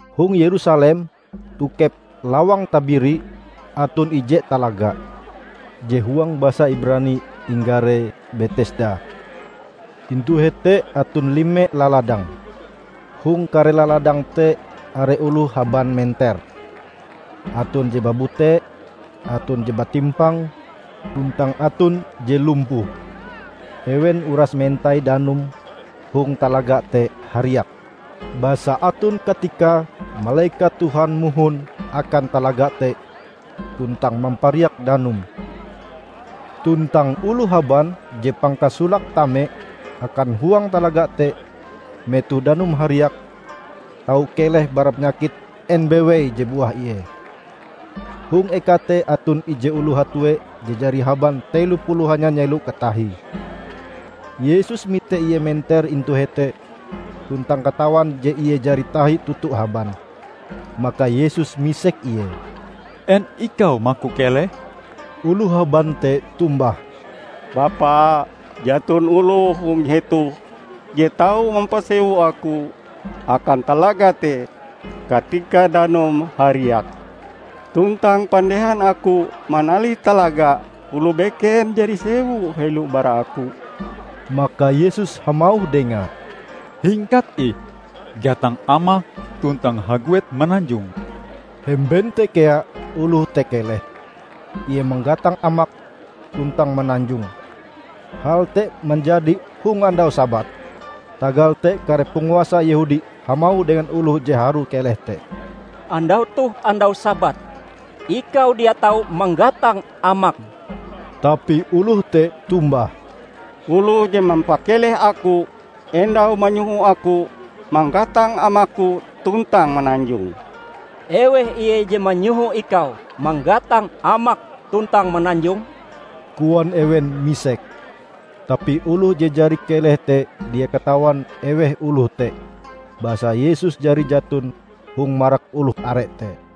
Hong Yerusalem tokep "Lawang Tabiri" aton ije talaga, je huang basa Ibrani inggare Betesda. Intu hete aton lime laladang. Hong kare laladang te are oloh haban menter; aton je babute, aton je batimpang, tuntang aton je lumpuh. [Ewen uras mentai danum hong talaga te hariak. Basa aton katikae malekat Tuhan mohon akan talaga te tuntang mampariak danume. Tuntang oloh haban je pangkasolake tame akan huang talaga te metoh danume hariak, tau keleh bara panyakit en bewei je buah ie.] Hong eka te aton ije oloh hatue je jari haban telo puluh hanya nyelo katahie. Yesus mite ie menter intu hete tuntang katawan je ie jari tahi toto haban; maka Yesus misek ie, "En ikau maku keleh?" Oloh haban te tombah, "Bapa, jaton oloh hong hetoh je tau mampasewu aku akan talaga te katika danume hariak. Tuntang pandehan aku manalih talaga oloh beken jari sewu helo bara aku." Maka Yesus hamauh dengae, "Hingkat ih, gatang amakm tuntang haguet mananjong." Hemben te kea oloh te keleh. Ie manggatang amake tuntang mananjong. Hal te manjadi hong andau Sabat. Tagal te kare panguasa Yehudi hamauh dengan oloh je harue keleh te, "Andau toh andau Sabat. Ikau dia tau manggatang amakm." Tapi oloh te tombah, "Oloh je mampakeleh aku endau manyoho aku manggatang amakku tuntang mananjong." "Eweh Ie je manyoho ikau manggatang amakm tuntang mananjong?" koan ewen misek. Tapi oloh je jari keleh te dia katawan eweh oloh te, basa Yesus jari jaton hong marak oloh are te.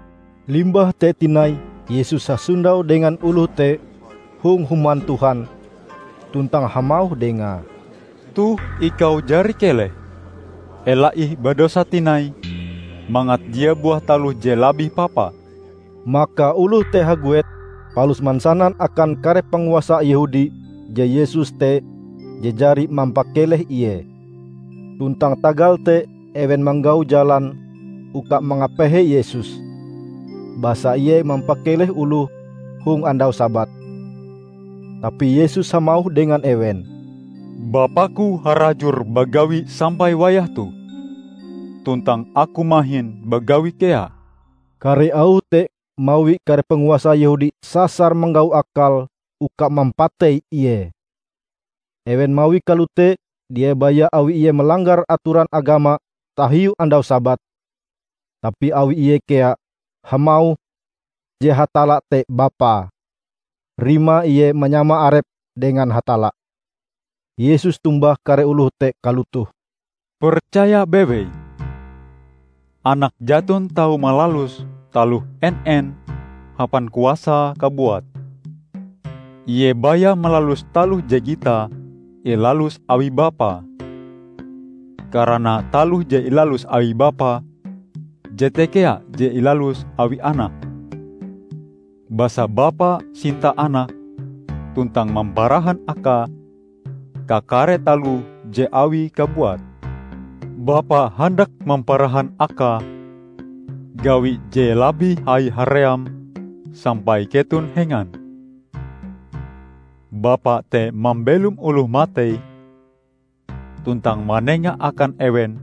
Limbah te tinai Yesus hasondau dengan oloh te hong Human Tuhan, tuntang hamauh dengae, "Toh ikau jari keleh. Ela ih badosa tinai mangat dia buah taloh je labih papa." Maka oloh te haguet palus mansanan akan kare panguasa Yehudi je Yesus te je jari mampakeleh ie. Tuntang tagal te ewen manggau jalan uka mangapehe Yesus, basa Ie mampakeleh oloh hong andau Sabat. Tapi Yesus hamauh dengan ewen, "Bapa-Ku harajur bagawi sampai wayah toh, tuntang Aku mahin bagawi kea." Kare auh te mawi kare panguasa Yehudi sasar manggau akal uka mampatei Ie. Ewen mawie kalote, dia baya awi Ie malanggar atoran agama tahiu Andau Sabat, tapi awi Ie kea hamauh je Hatalla te Bapae; rimae Ie manyama arepe dengan Hatalla. Yesus tombah kare oloh te kalotoh, "Percaya bewei, Anak jaton tau malalus taloh en-en hapan kuasae kabuat. Ie baya malalus taloh je gitae ilalus awi Bapae. Karana taloh je ilalus awi Bapa, jete kea je ilalus awi Anak. Basa Bapa sinta Anak tuntang mamparahan Akae kakare taloh je Awie kabuat. Bapa handak mamparahan Akae gawi je labih hai haream sampai keton hengan. Bapa te mambelom oloh matei tuntang manenga akan ewen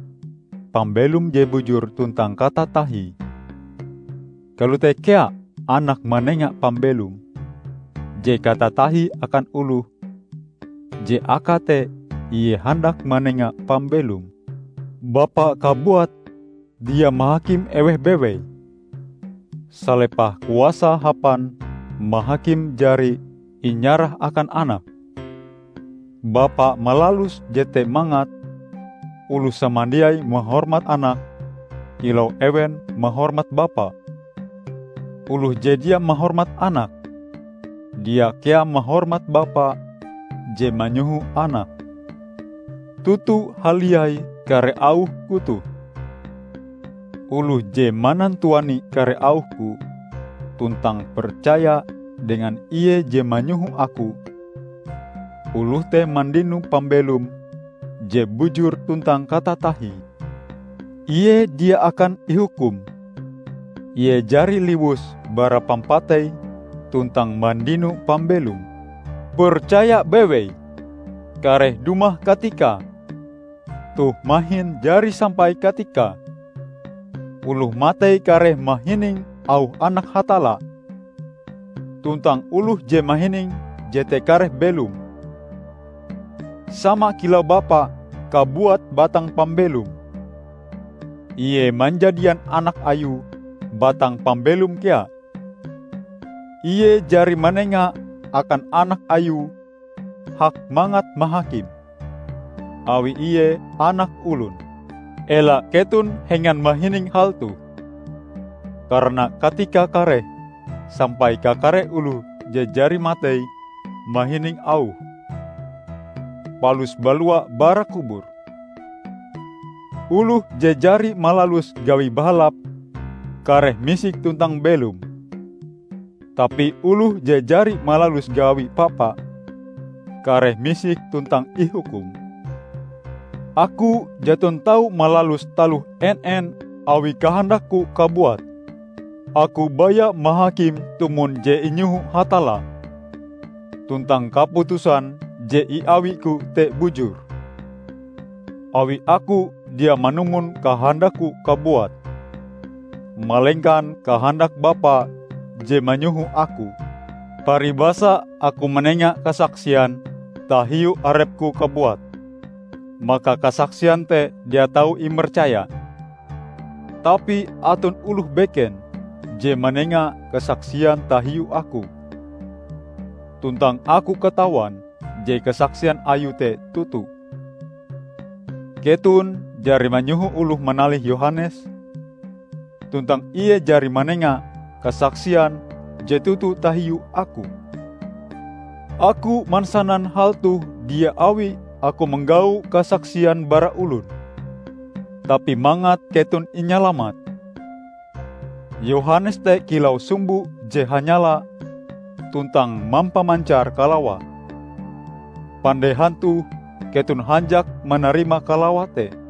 pambelom je bujur tuntang katatahie; kalote kea Anak manenga pambelom je katatahie akan oloh je akae te Ie handak manenga pambelom. Bapa kabuat dia mahakim eweh bewei. Salepah kuasae hapan mahakim jari inyarah akan Anak. Bapa malalus jete mangat oloh samandiai mahormat Anak kilau ewen mahormat Bapa. Oloh je dia mahormat Anak dia kea mahormat Bapa je manyoho Anak. Toto haliai kare auh-Ku toh: Oloh je manantuani kare auh-Ku, tuntang percaya dengan Ie je manyoho Aku, oloh te mandino pambelom je bujur tuntang katatahie. Ie dia akan ihukum; ie jari liwus bara pampatei tuntang mandino pambelom. Percaya bewei: Kareh dumah katikae -- toh mahin jari sampai katikae -- oloh matei kareh mahining auh Anak Hatalla. Tuntang oloh je mahining jete kareh belom. Sama kilau Bapa kabuat batang pambelom, Ie manjadian Anak Ayue batang pambelom kea. Ie jari manenga akan Anak Ayue hak mangat mahakim, awi Ie Anak Olon. Ela keton hengan mahining hal toh, karana katikae kareh sampai kakare oloh je jari matei mahining auhe, palus balua bara kubur. Oloh je jari malalus gawi bahalap kareh misik tuntang belom. Tapi oloh je jari malalus gawi papa kareh misik tuntang ihukum." "Aku jaton tau malalus taloh en-en awi kahandak-Ku kabuat. Aku baya mahakim tumon je inyoho Hatalla. Tuntang kaputusan je iawi-Ku te bujur, awi Aku dia manumon kahandak-Ku kabuat, malengkan kahandak Bapa je manyoho Aku. Paribasa Aku manenga kasaksian tahiu arep-Ku kabuat, maka kasaksian te dia tau imercaya. Tapi aton oloh beken je manenga kasaksian tahiu Aku, tuntang Aku katawan je kasaksian Ayue te toto. Keton jari manyoho oloh manalih Yohanes, tuntang ie jari manenga kasaksian je toto tahiu Aku. Aku mansanan hal toh dia awi Aku manggau kasaksian bara olon, tapi mangat keton inyalamat. Yohanes te kilau sumbo je hanyala tuntang mampamancar kalawa. Pandehan toh keton hanjak manarima kalawa te.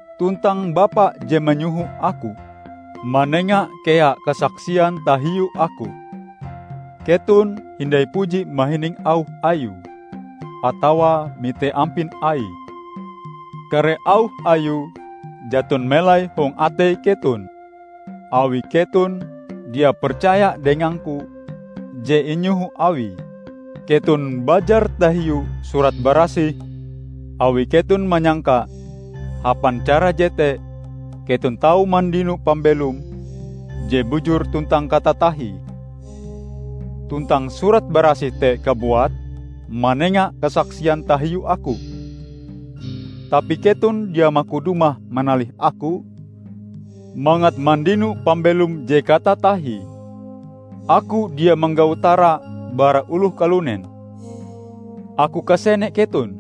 Tuntang Bapa je manyoho Aku, manenga kea kasaksian tahiu Aku. Keton hindai puji mahining auh Ayue atawa mite ampin Aie. Kare auh Ayue jaton melai hong atei keton awi keton dia percaya dengang-Ku je inyoho Awie. Keton bajar tahiu Surat Barasih awi keton manyangka hapan cara jete keton tau mandino pambelom je bujur tuntang katatahie. Tuntang Surat Barasih te kabuat manenga kasaksian tahiu Aku. Tapi keton dia maku dumah manalih Aku mangat mandino pambelom je katatahie. Aku dia manggau tara bara oloh kalunen. Aku kasene keton.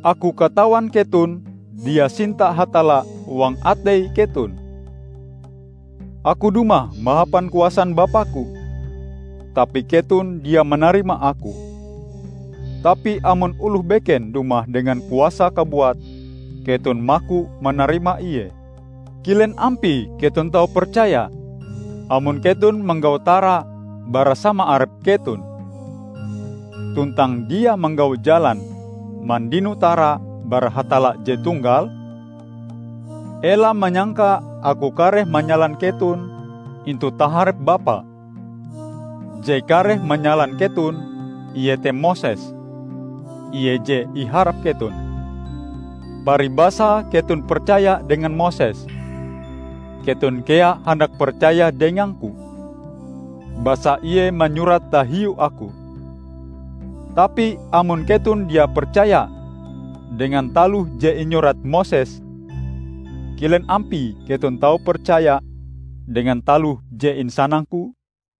Aku katawan keton dia sinta Hatalla huang atei keton. Aku dumah mahapan kuasan Bapa-Ku, tapi keton dia manarima Aku. Tapi amon oloh beken dumah dengan kuasae kabuat, keton maku manarima ie. Kilen ampie keton tau percaya, amon keton manggau tara bara sama arep keton, tuntang dia manggau jalan mandino tara bara Hatalla je Tunggal? Ela manyangka Aku kareh manyalan keton intu taharep Bapa. Je kareh manyalan keton iete Moses, ie je iharap keton. Paribasae keton percaya dengan Moses, keton kea handak percaya dengang-Ku, basa ie manyurat tahiu Aku. Tapi amon keton dia percaya dengan taloh je inyurat Moses, kilen ampie keton tau percaya dengan taloh je insanang-Ku?"